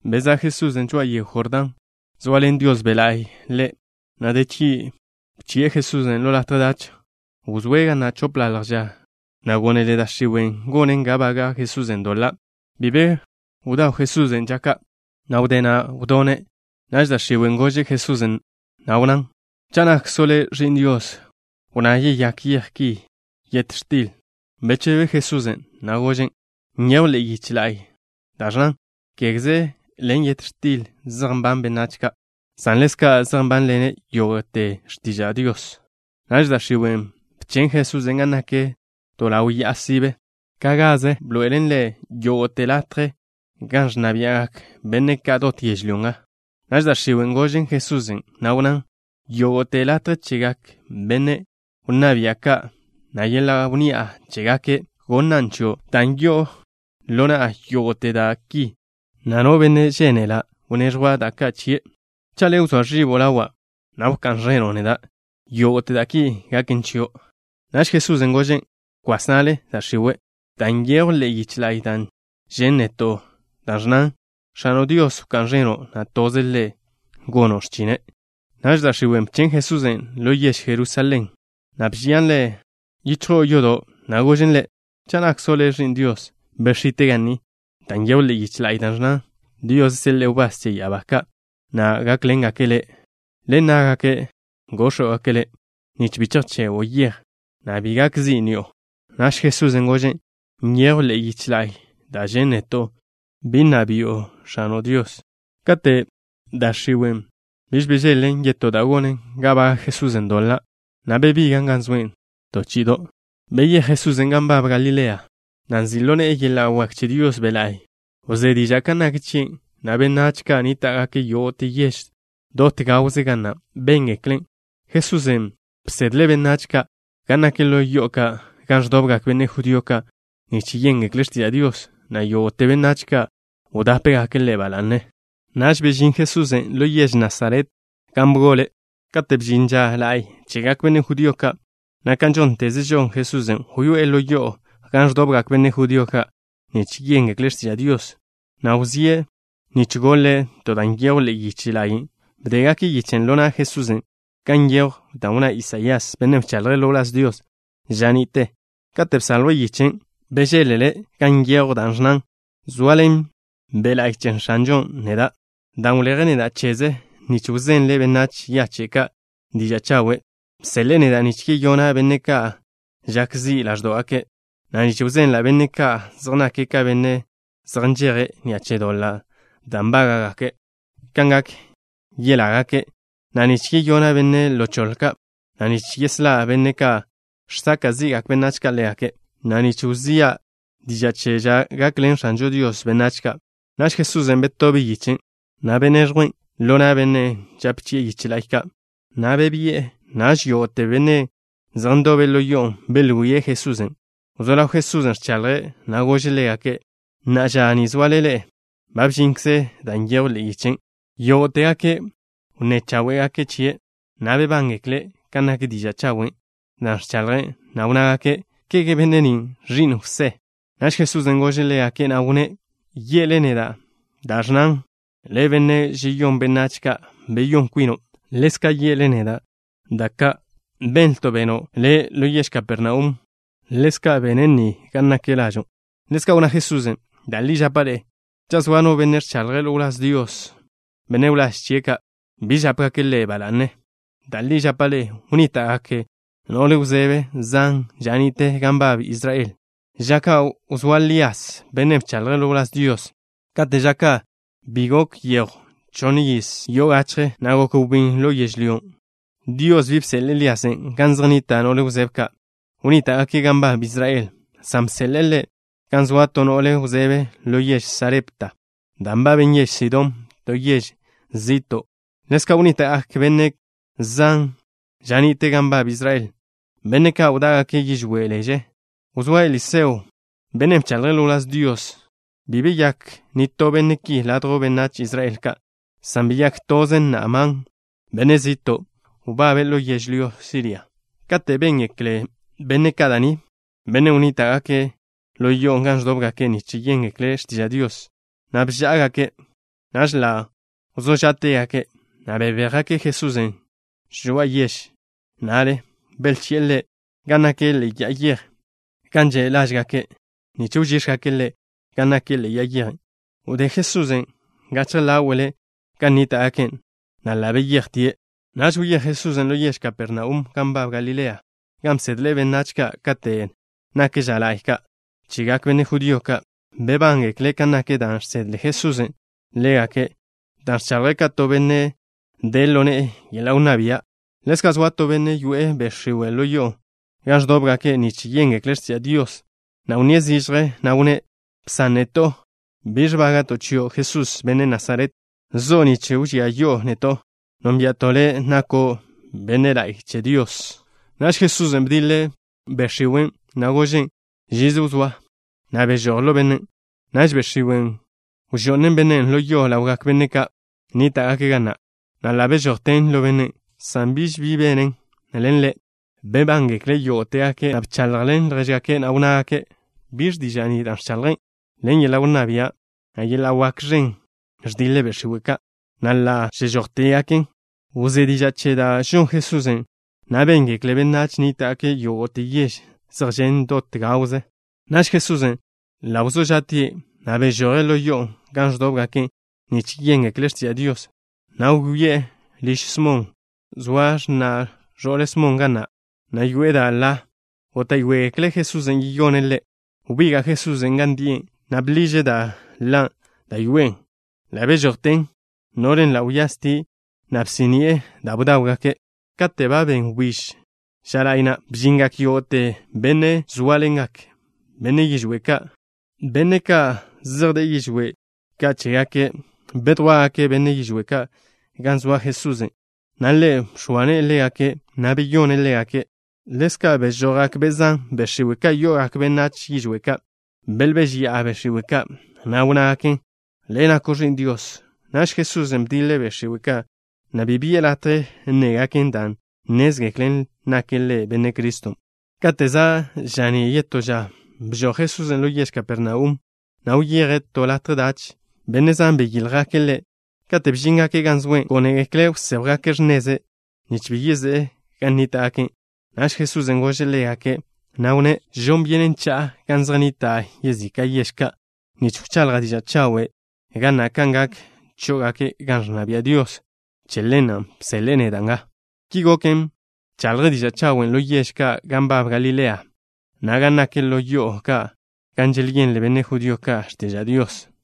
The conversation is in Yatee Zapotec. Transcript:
Bezá' Jesusen' žoa'a yego Jordán, zoaḻen Dios Be' La'y Ḻe', na' de chgi' bchi'e Jesusen' ḻo latje dach. Wzóe' ga na' chopḻalj ža, na' gónele da' x̱iwe' gonen ga baga' Jesusen' doḻa'. Bi be bdaw Jesusen' ža ka', na' wdé na' wdone'. Naž da' x̱iwen' gožen Jesusen', na' wnnán: —Cha' nakkzo' Le' Ẕi'n Dios, wnná yeyák yej ni yet x̱til. Bechebe Jesusen', na' gožen': —Nyejw ḻe'e yich da' ẕnnan: “Kégeze ḻen yet x̱til zej nban benách ka', san ḻezka' zej nbánḻene' yógo'te x̱tiža' Dios.” Naž da' x̱iwen' bchen' Jesusen' gan nak to ḻaw ya'a sibe. To chí'ido'ze bḻoe'elen Ḻe' yógo'te latje gan ẕnna bia'gak benne' ka' dot yežlyó nga. Naž da' x̱iwen' gožen Jesusen', na' wnnán: —Yógo'te latje chegak benne' wnná bia' ka', na' yeḻa' wnni'a chégake', gonnan' chio', dan' yo'o ḻo na'a yógo'te da' ki, na' no benne' žénela' wneẕjwa' da' ka' chie'. Cha' Le' wzóa ẕibo' ḻawa', na' wká'n ẕeno' neda', yógo'te da' ki gaken chio'. Naž Jesusen' gožen': —Kwas na'le, da' x̱iwe', dan' nyejw ḻe'e yich la'y dan' žen' neto', dan' ẕnnan: “X̱ano' Dios wká'n ẕeno', na' toze Ḻe' gono' x̱chine'.” Naž da' x̱iwen' bchen' Jesusen' ḻo yež Jerusalén, na' bžian Ḻe' yichjo'o yodo', na' gožen Ḻe': —Cha' nakkzo' Le' Ẕi'n Dios, bex̱ite' ga ni dan' nyejw ḻe'e yich la'y da' ẕnnan: Dios seḻe'e wbás che ya'abá ka', na' gákḻengake' Le'. Ḻen ná'gake' góx̱wgake' Le' nich bi chejchego'o yej, na' bi gak zi' ni'o. Naž Jesusen' gožen': —Nyejw ḻe'e yich la'y da' žen' neto': “Bi wkonlo' žin X̱ano' Dios.” Kate' da' x̱iwen' bi bžeḻ-len yetó da' gonen ga baga' Jesusen' doḻa', na' bebigan' gan zoe' to chi'ido'. Beyéj Jesusen' gan nbab Galilea, na' nzi' ḻo ne'e yeḻa' wak che Dios Be' La'y. Wzé diža' kan nak chie', na' benách ka' nníta'gake' yógo'te yež dot gawze ga na' béngeklen'. Jesusen' bsedle' benách ka' gan nak ḻo yo'o ka' gan ẕdobgak benne' judío ka' nich yéngekle' x̱tiža' Dios, na' yógo'te benách ka' wdápegake' Ḻe' ba la'ne. Naž bežín Jesusen' ḻo yež Nasaret gan bgole'. Kate' bžin ža la'y chegak benne' judío ka', na' kan žónteze žon Jesusen', wyoé'e ḻo yo'o gan ẕdobgak benne' judío ka' nich yéngekle' x̱tiža' Dios, na' wzíe' nich goḻe' to da' nyejw ḻe'e yich la'y. Bdégake' yichen' ḻo na' Jesusen' gan nyejw da' wnná Isaías, bennen' bchaḻje' ḻo wláz Dios ža ni'te. Kate' bsaljwe' yichen', bežeḻ-le' gan nyejw da' ẕnnan: Zoaḻen Be' La'y che X̱anžon' neda' dan' wleje' neda' cheze' nich wzenla' benách yache' ka' diža' chawe'. Bseḻe'e neda' nich yeyona' benne' ka' žak zi' ḻáẕdo'gake', na' nich wzenla' benne' ka' zej nake' ka benne' zej nžeje' ni'a che doḻa' da' nbága'gake', kan gak yelágake', na' nich yeyona' benne' ḻo choḻe ka', na' nich yeslá' benne' ka' žsaka' zi'gak benách ka' ḻégake', na' nich wzía' diža' che ža gakḻen X̱anžo Dios benách ka'. Naž Jesusen' betobe' yichen', na' bedíen' ḻo na' bennen' žape chi'e yiche la'y ka', na' bebi'e. Naž yógo'te benne' zej ndobe' ḻo yo'on', belwíe' Jesusen'. Wzó ḻaw Jesusen' ẕchaḻje', na' gože' ḻégake': —Na'a ža ni zoale ḻe'e, ba bžinkze dan' nyejw ḻe'e yichen'. Yógo'tegake' wnné cháwe'gake' chie', na' bebángekle' kan nak diža' chawen' da' ẕchaḻje', na' wnnágake': —¿Kege benne' ni ẕi'n Jwsé? Naž Jesusen' gože' ḻégake', na' wnné': —Ye'le neda' da' ẕnnan: “Le', benne' žeyón benách ka', beyón kwino'.” Ḻezka' ye'le neda': “Da' ka' benlto' beno' Le' ḻo yež Kapernaum, ḻezka' ben ga ni naken lažo'.” Ḻezka' wnná Jesusen': —Da' li žapa' ḻe'e, cha' zoa no benne' ẕchaḻje' ḻo wláz Dios, benne' wláž chie' ka' bi žápegake' ḻe' ba la'ne. Da' li žapa' ḻe'e, wnníta'gak no'le wzebe zan ža ni'te gan nbab Israel, ža ka' wzóa Lías, bennen' bchaḻje' ḻo wláz Dios. Kate' ža ka' bi gok yejw chonn yiz yo'o gachje, na' gok wbín ḻo yežlyón'. Dios bi bseḻe'e Líasen' gan zej nnita' no'le wzebe ka' wnníta'gake' gan nbab Israel, san bseḻe'e ḻe' gan zoa to no'le wzebe ḻo yež Sarepta, da' nbaben yež Sidón, to yež zi'to'. Ḻezka', wnníta'gak benne' zan ža ni'te gan nbab Israel, benne' ka' wdá'gake' yižwé' leže ža ka' wzóa Eliseo, bennen' bchaḻje' ḻo wláz Dios. Bi beyák nitó benne' ki ladjw benách Israel ka', san beyák toze Naamán, benne' zi'to' wbabe' ḻo yežlyó Siria. Kate' béngekle benne' ka' da' ni, benne' wnníta'gake' ḻo yo'o gan ẕdóbgake' nich yéngekle' x̱tiža' Dios, na' bžá'agake'. Naž ḻa' wzó žá'tegake', na' bebéjgake' Jesusen' žoa'a yež na'le. Belchi'e Ḻe' gan nak ḻe'e ya'a yej gan že' lážgake' nich wžíx̱jgake' Ḻe' gan nak ḻe'e ya'a yej na'. Wdé Jesusen' gachje ḻáwe'le gan nníta'gake', na' ḻa' beyejtie'. Naž wyéj Jesusen' ḻo yež Kapernaum gan nbab Galilea, gan bsedle' benách ka' kate' nak ža la'y ka' chegak benne' judío ka'. Bebángekle' kan nak dan' žsedle Jesusen' ḻégake', dan' ẕchaḻje' ka to benne' de ḻo ne'e yeḻa' wnná bia'. Ḻezka' zoa to benne' yoe'e be' x̱iwe' ḻo yo'o gan ẕdóbgake' nich yéngekle' x̱tiža' Dios, na' wnníe' zižje, na' wnné': —Bsan neto'. ¿Biẕ nbága'to' chio', Jesús, benne' Nasaret? ¿Zo'o nga nich wžía yi'o neto'? Nónbia'to' Le' No nako'. Benne' la'y che Dios nako'. Naž Jesusen' bdiḻe' be' x̱iwen', na' gožen': —Žize wzóa, na' bežój ḻo bennen'. Naž be' x̱iwen' wžo'nen bennen' ḻo yo ḻawgak benne' ka' nníta'gake' ga na', na' ḻa' bežojten ḻo bennen', san biž bi benen ḻen ḻe'. Bebángekle' yógo'tegake', na' bchaḻjḻen ljéžgake', na' wnnágake': —¿Biẕ diža' ni dan' ẕchaḻjen'? Ḻen yeḻa' wnná bia', na' yeḻa' wak ẕen ẕdiḻe' be' x̱iwe' ka', na' ḻa' žežójtegaken. Wzé diža' che da' žon Jesusen', na' béngekle benách nníta'gake' yógo'te yež zej žen' dot gawze. Naž Jesusen' ḻa' wzó ža'tie', na' bežoje' ḻo yo'o gan ẕdóbgake' nich yéngekle' x̱tiža' Dios, na' wyoé'e liž Smon. Zoa x̱na' ẕo'le Smon ga na', na' yoe'e da' ḻa. Góta'yoegekle' Jesusen' yeyone' ḻe'. Wbiga' Jesusen' gan die', na' bḻiže' da' ḻa da' yoe'e. Ḻa' bežojten. No'len' ḻa' wyastie', na' bsí'ni'e da' bdáwgake'. Kate' ba ben wbíž ža la'y na', bžingak yógo'te benne' zóaḻengak benne' yižwé' ka' ḻégake', benne' ka' zej de'e yižwé' ka' che chégake'. Bedjwá'gake' benne' yižwé' ka' gan zoa Jesusen', na' Ḻe' bx̱oa ne'e ḻégake', na' beyone' ḻégake'. Ḻezka' bežojgak be' zan, be' x̱iwe' ka' yo'ogak benách yižwé' ka'. Belbéžeya'a be' x̱iwe' ka', na' wnnágaken: —Le' nako' Ẕi'n Dios. Naž Jesusen' bdiḻe' be' x̱iwe' ka', na' bi bi'e latje nnégaken, dan' nnézgeklen nake' Ḻe' Benne' Criston'. Kate' za' ža'ní' yetó ža, bžoj Jesusen' ḻo yež Kapernaum, na' wyeje' to latje dach. Benne' zan beyíljgake' Ḻe'. Kate' bžíngake' gan zoe', gónegekle' wséjwgake' x̱neze', nich bi yezé'e gan nníta'gake'. Naž Jesusen' gože' ḻégake', na' wnné': —Žon byenen cha'a gan zej nnita' yezika' yež ka', nich wchaḻja' diža' chawe' ga na' kan gak chó'ogake' gan ẕnna bia' Dios. Che ḻen bseḻe'e neda' nga. Ki goken, bchaḻje' diža' chawen' ḻo yež ka' gan nbab Galilea, na' gan nak ḻo yo'o ka' gan želyenle benne' judío ka' x̱tiža' Dios.